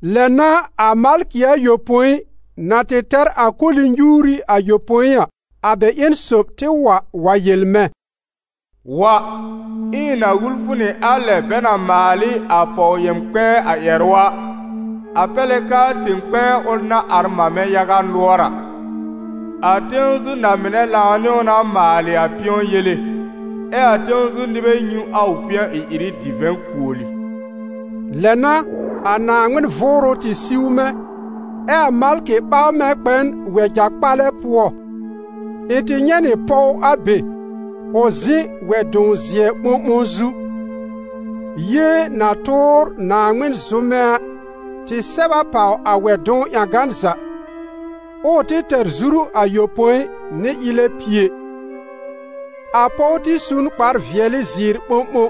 Lɛ n'a a malkɩ ayopõi na tɩ tɛr a koli-nyuuri ayopõi a, a bɛ ƴẽn sob tɩ wa wa yel mɛ̃: «Wa, ɛ ɩ̃ na wul fʋ nɩ a lɛ bɛ na maal ɩ a pɔw-yɛm-kpɛ̃ɛ a ƴɛrʋ a, a pɛr lɛ k'aa tẽ-kpɛ̃ɛ ʋl na ar mamɛ yaga nʋɔr a. A tẽw zu na-mɩnɛ lãw nɩ ʋ na maalɩ a pɩ̃ɔ yele, ɛ a tẽw zu nɩbɛ nyũ a ʋ pɩ̃ɔ ɩ-ɩrɩ divɛ̃ kuoli.» Lɛ n'a a Naaŋmɩn Vʋʋrʋ tɩ siw mɛ̃, ɛ́ a malkɩ ɓaw mɛ̃ kpɛ n wɛja-kpalɛ pʋɔ. Ɩ̃ tɩ nyɛ̃ nɩ pɔw a be, ʋ zɩ̃ wɛ-dʋ̃w-zɩɛ ɓõɓõ zu; yée na tʋʋr Naaŋmɩn zʋmɛ a tɩ sɛb a pàw a wɛ-dʋ̃w ƴãgan za, ɛ ʋ tɩ tɛr zuru ayopõi nɩ ɩlɛ pie. A pɔw tɩ su n kpar-vɩɛlɩ zɩɩr ɓõɓõ,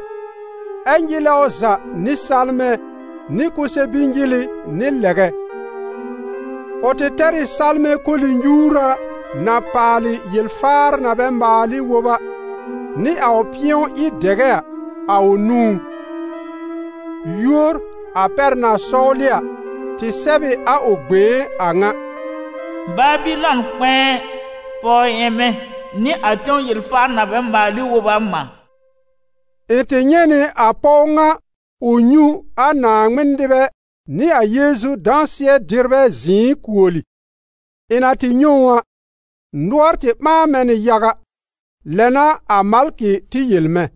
ɛ nyɩlɛ ʋ za nɩ salmɛ̃ nɩ kʋsɛ-bi-nyɩlɩ nɩ lɛgɛ. Ʋ tɩ tɛr ɩ salmɛ̃ koli-nyuura na paalɩ yel-faar na bɛ maal ɩ wob a, nɩ a ʋ pɩ̃ɔ-ɩ-dɛgɛ a, a ʋ nũú. Yúor, a pɛr na sɔwlɩ a, tɩ sɛb ɩ a ʋ gbẽé a ŋa: « Babɩlɔn kpɛ̃ɛ, pɔw-yɛmɛ nɩ a tẽw yel-faar na bɛ maal ɩ wob a mã.» Ɩ̃ tɩ nyɛ̃ nɩ a pɔw ŋa ʋ nyũ a Naaŋmɩn nɩbɛ nɩ a Yeezu dãsɩɛ dɩrbɛ zɩ̃ɩ kuoli. Ɩ̃ na tɩ nyɛ̃ ʋ a, nʋɔr tɩ ɓãa mɛ̃ nɩ yaga. Lɛ n'a a malkɩ tɩ yel mɛ̃: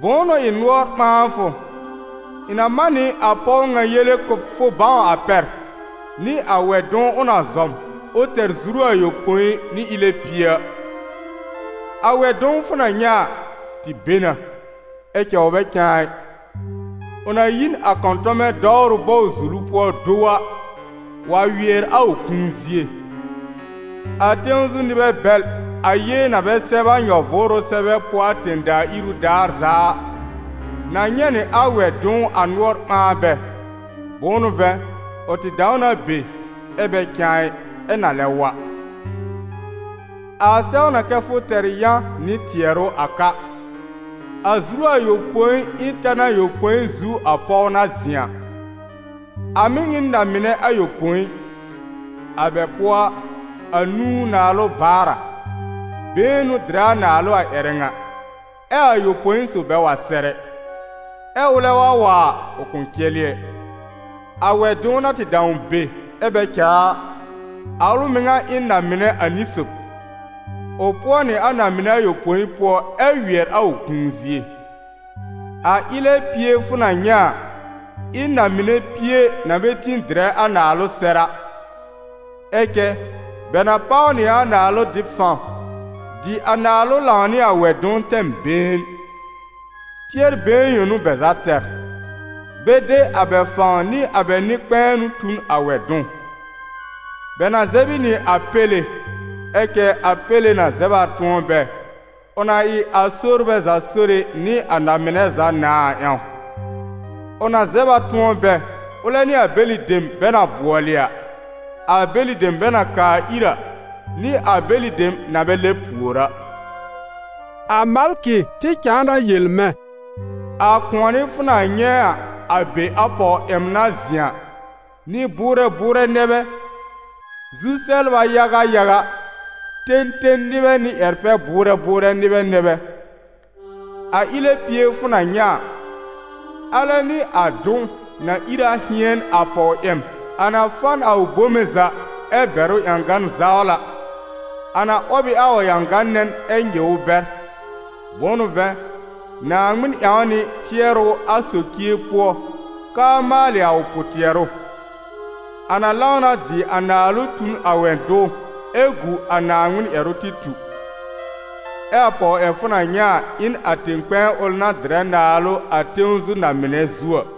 «Bʋ̃ʋ n'ʋ ɩ nʋɔr ɓãa fʋ? Ɩ̃ na man nɩ a pɔw ŋa yele kʋ̀ b fʋ bãw a pɛr, nɩ a wɛ-dʋ̃w ʋ na zɔm, ʋ tɛr zuru ayopõi nɩ ɩlɛ pie a. A wɛ-dʋ̃w fʋ na nyɛ̃ a, tɩ be na, ɛ cɛ ʋ bɛ cãa ɩ; ʋ na yi n a kɔ̃tɔmɛ dɔwrʋ bɔw-zulu pʋɔ do wa, wa wɩɛr a ʋ kũu zie. A tẽw zu nɩbɛ bɛl, a yée na bɛ sɛb a nyɔ-vʋʋrʋ sɛbɛ pʋɔ a tẽ-daa iru daar za a, na nyɛ̃ nɩ a wɛ-dʋ̃w a nʋɔr ɓãa bɛ, bʋ̃ʋ n'ʋ vɛ̃, ʋ tɩ dãw na be, ɛ bɛ cãa ɩ, ɛ na lɛ wa.» «A sɛw na kɛ fʋ tɛr yã nɩ tɩɛrʋ a ka. A zuru ayopõi ɩ n tan ayopõi zu a pɔw na zɩ̃ a. A mɩ̀ ɩ n na-mɩnɛ ayopõi: a bɛ pʋɔ a, anũu naalʋ baar a, been n'ʋ dɩrɛ a naalʋ a ƴɛrɛ ŋa, ɛ a ayopõi sob bɛ wa sɛr ɛ; ɛ ʋlɛ wa wa a, ʋ kʋ̃ cɛlɩ ɛ. A wɛ-dʋ̃w na tɩ dãw be, ɛ bɛ cãa a, a ʋl mɩŋa ɩ n na-mɩnɛ ani sob. Ʋ pʋɔ nɩ a na-mɩnɛ ayopõi pʋɔ ɛ wɩɛr a ʋ kũu zie.» «A ɩlɛ pie fʋ na nyɛ̃ a, ɩ n na-mɩnɛ pie na bɛ tĩ dɩrɛ a naalʋ sɛr a; ɛ cɛ bɛ na páw nɩ a naalʋ dɩb fãw, dɩ a naalʋ lãwnɩ a wɛ-dʋ̃w tɛm been. Tɩɛr-been yõ n'ʋ bɛ za tɛr: bɛ de a bɛ fãw nɩ a bɛ nɩ-kpɛ̃ɛnʋ tu n a wɛ-dʋ̃w. Bɛ na zɛb ɩ nɩ a Péle, ɛ cɛ a Péle na zɛb a tʋ̃ɔ bɛ, ʋ na ɩ a sorbɛ za Sore nɩ a na-mɩnɛ za Nãà a ƴãw; ʋ na zɛb a tʋ̃ɔ bɛ, ʋlɛ nɩ a bɛlɩ dem bɛ na bʋɔlɩ a, a bɛlɩ dem bɛ na kaa ir a, nɩ a bɛlɩ dem na bɛ lɛb pùor a.» A malkɩ tɩ cãa na yel mɛ̃: «A kʋ̃ɔnɩ fʋ na nyɛ̃ a, a be a pɔw-yɛm na zɩ̃ a, nɩ-bʋʋrɛ bʋʋrɛ nɛ bɛ, zu-sɛbla yaga yaga, ten ten nɩbɛ nɩ ƴɛr-pɛ-bʋʋrɛ bʋʋrɛ nɩbɛ nɛ bɛ. A ɩlɛ pie fʋ na nyɛ̃ a, alɛ nɩ a dʋ̃w, na ìr a hɩ̃ɛn a pɔw-yɛm, a na fa n a ʋ bome za, ɛ bɛr ʋ ƴãgan zawla, a na 'wɔb ɩ a ʋ ƴãgã-nɛn ɛ nyɩw ʋ bɛr. Bʋ̃ʋ n'ʋ vɛ̃, Naaŋmɩn ƴãw a nɩ tɩɛrʋ a socie pʋɔ k'aa maalɩ a ʋ pʋ-tɩɛrʋ; a na lãw na dɩ a naalʋ tu n a wɛ-dʋ̃w ɛ gu a Naaŋmɩn ƴɛrʋ tɩ tu.» «Ɛ a pɔw fʋ na nyɛ̃ a ɩ n a tẽ-kpɛ̃ɛ ʋl na dɩrɛ naalʋ a tẽw zu na-mɩnɛ zu a.»